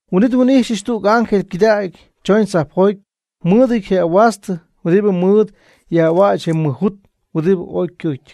Huin'it nhuin'ijxyɨch tüg ángel ycɨdägy chooñ tzajpjoty mɨɨdɨty je ahuastɨ huɨdibɨ mɨɨd yaj'ahuäch je mɨj jut huɨdibɨ oy ycɨɨcyɨty,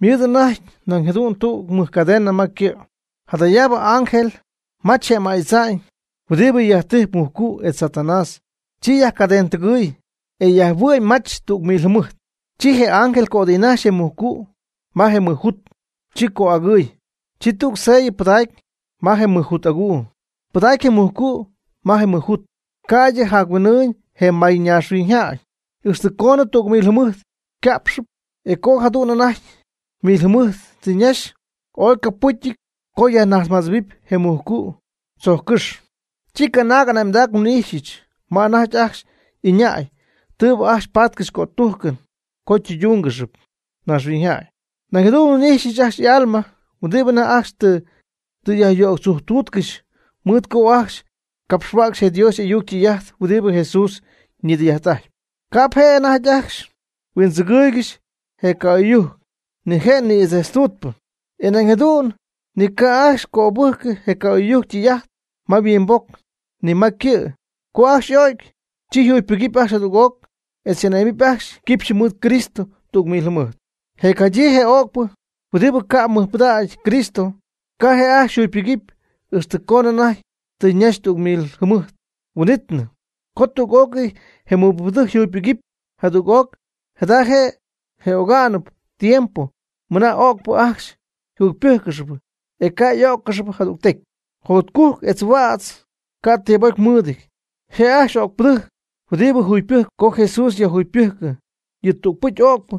ymɨɨd anajty nañ jadu'n tüg mɨjcadena ma ycɨ'. Jadayaabɨ ángel majch je ama'y tza'ñ huɨdibɨ yajtijp mujcu' etz Satanás, chi yajcadenɨtɨgɨɨy, e yajhuɨ'my mach tüg mil jɨmɨjt. Chi je ángel cötijnajxy je mujcu' ma je mɨj jut, chi cö'agɨɨy. Chi tüg sellɨ pɨdacy ma je mɨj jut aguu. Pɨdacy je mujcu' ma je mɨj jut, ca'ydɨ jac-huin'ɨɨñ je mayñaaxhuiñyjäy, ixtɨ coonɨ tüg mil jɨmɨjt yca'pxɨpy. E co jadu'n anajty mil jɨmɨjt tɨ ñaxy, ooy ycopɨcyɨty co yajnajtzmadzɨ̈huɨpy je mujcu' tzojccɨ́xy. Chi canaag ane'mdac nhuin'ijxyɨch ma anajty ajcxy ɨñäy tɨɨbɨ ajcxy patcɨxy cötujcɨn co tɨydúngɨxɨpy naaxhuiñyjäy. Nañ jadu'n nhuin'ijxyɨch ajcxy y'alma huɨdibɨ anajty ajcxy tɨ yajyöctzujctuutcɨxy mɨɨd co ajcxy capxhuäcxy je Dios y'ayuc ytɨy'ajt huɨdibɨ Jesús ñidɨy'ajt'ajt. Ca'p je' ajcxy anajty huindzɨgɨɨygɨxy je ca'oy'ɨyujc, ni je' ñïdzejtztuutɨn. E nañ jadu'n ni ca' ajcxy cöbɨjcɨ je ca'oy'ɨyujc ytɨy'ajt ma yhuimboc ni ma ycɨ'. Co ajcxy y'o'cy, chi yjugypɨgɨpy ajcxy jadüg'oc etz ane'mɨp ajcxy quipxyɨ mɨɨd Cristo tüg mil jɨmɨjt. Je jacjadyii je öcpɨ, huɨdibɨ ca'p mɨjpɨdacy Cristo, ca' je' ajcxy yjugypɨgɨpy, ixtɨ coonɨ anajty tɨ ñaxy tüg mil jɨmɨjt huin'ítnɨ. Co tüg'ócɨy je mɨbɨjcpɨdɨjc yjugypɨgɨpy jadüg'oc, jada je' je ogá'nɨbɨ tiempo mɨna öcpɨ ajcxy yjugypɨjccɨxy, e ca' y'oc'ó'ccɨxnɨp jadügtecy. Jotcujc etz huädz, ca' tibocy mɨɨdɨty, je' ajcxy öcpɨdɨjc huɨdibɨ jugypɨgɨpy co Jesús yajjugypɨgɨpy yɨ tügpɨcy öcpɨ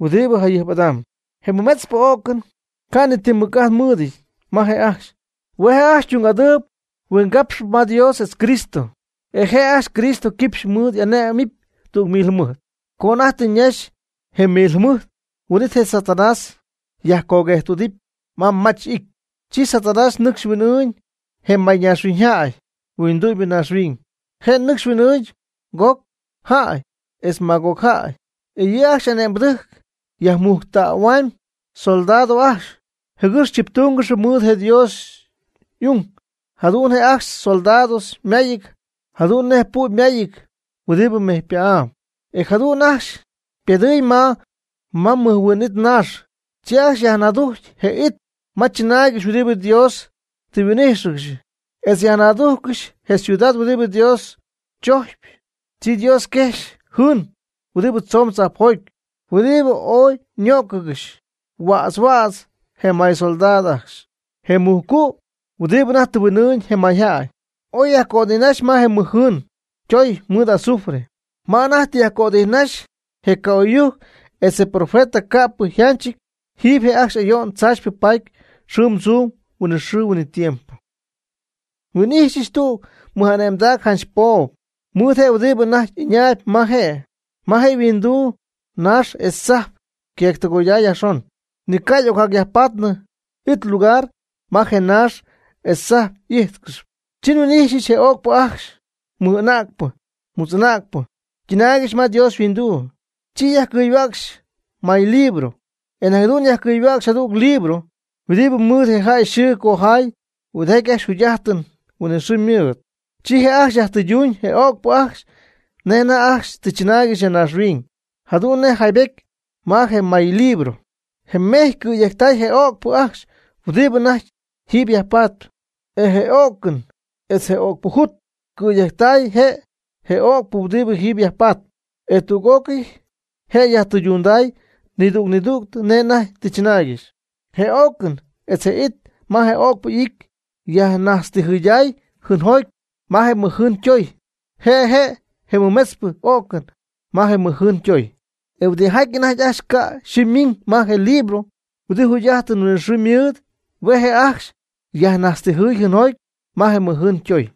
huɨdibɨ jayɨjp'adamb. Je mɨmetzpɨ o'cɨn ca' ni ti mɨc'ajt mɨɨdɨty ma je' ajcxy. Hue' janch ajcxy ytung'adɨɨyb huingapxɨɨ ma Dios etz Cristo. E je' ajcxy Cristo quipxy mɨɨd y'ane'mɨp tüg mil jɨmɨjt. Co anajty tɨ ñaxy je mil jɨmɨjt, huin'it je Satanás yajcoguejttüdɨpy ma ymach'ity. Chi Satanás nɨcxy huin'ɨɨñ je mayñaaxhuiñyjäy huindu'mybɨ ñaaxhuiñ. Je' nɨcxy huin'ɨɨñ Gog jäy etz Magog jäy. E yɨ' ajcxy y'ane'mbɨdɨjc yajmujctähua'ñ soldado ajcxy, jɨgɨx chiptúngɨxɨpy mɨɨd je Dios y'ung. Jadu'n je' ajcxy soldados ymayɨty jadu'n nej pu' ymayɨty huɨdibɨ mejypä'ám. E jadu'n ajcxy ypedɨɨy ma ymɨjhuiinɨty naax, chi ajcxy yajnaadujcy je it ma chɨnaaygɨxy huɨdibɨ Dios tɨ huin'íjxɨgɨxy etz yajnaadujccɨxy je ciudad huɨdibɨ Dios chojcpy. Chi Dios quejxy jɨɨn huɨdibɨ tzoomb tzajpjoty, huɨdibɨ oy ñöcɨgɨxy huädz huädz je may soldados ajcxy. Je mujcu', huɨdibɨ anajty tɨ huin'ɨɨñ je mayjäy, oy yajcötijnaxy ma je mɨj jɨɨn ytoy mɨɨd azufre. Ma anajty tɨ yajcötijnaxy je ca'oy'ɨyujc etz je profeta, ca'pɨy yjanchɨty. Jiiby je' ajcxy ayo'n tzaachypɨ paadɨpy xɨɨm tzuum huinɨxɨɨ huinɨtiempo. Nhuin'ijxyɨch tüg mɨj'ane'mdac janch poob, mɨɨd je huɨdibɨ anajty ɨñaayb ma je'. Ma je' yhuinduu naax etz tzajp queectɨgoyday yajxon, ni ca' y'ocyajpatnɨ it lugar ma je naax etz tzajp y'íjtcɨxɨpy. Chi nhuin'ijxyɨch je öcpɨ ajcxy, mɨj'anäcpɨ mutz'anäcpɨ, ytɨnaaygɨxy ma Dios yhuinduu. Chi yajcɨyhuäcxtay maylibro. E nañ jadu'n yajcɨyhuäcxy jadüg libro huɨdibɨ mɨɨd je jäy yxɨɨ cojay huɨdijaty ajcxy jugy'ajtɨn huinɨxɨɨ mɨɨd. Chi je' ajcxy yajtɨyduñ je öcpɨ ajcxy nej anajty ajcxy tɨ chɨnaaygɨxy ya naaxhuiñ, jadu'n nej yjaybetyɨty ma je maylibro. Je mejy ycɨ̈yejctay je' je öcpɨ ajcxy huɨdibɨ anajty jiiby yajpatp. E je o'cɨn etz je öcpɨjut ycɨ̈yejctay je' je öcpɨ huɨdibɨ jiiby yajpatp, e tüg'ócɨy je' yajtɨydunday nidüg nidüg nej anajty tɨ chɨnaaygɨxy. Je o'cɨn etz je it ma je öcpɨ y'ity yajnajtztijɨyday jɨɨnjoty ma je mɨjjɨɨn ytoy. Je' je' je mɨmetzpɨ o'cɨn ma je mɨjjɨɨn ytoy. E huɨdijaty anajty ajcxy ca' yxɨɨ ymiiñ ma je libro huɨdibɨ jugy'ajtɨn huinɨxɨɨbɨ mɨɨd, hue' je' ajcxy yajnajtztijɨy jɨɨnjoty ma je mɨjjɨɨn ytoy.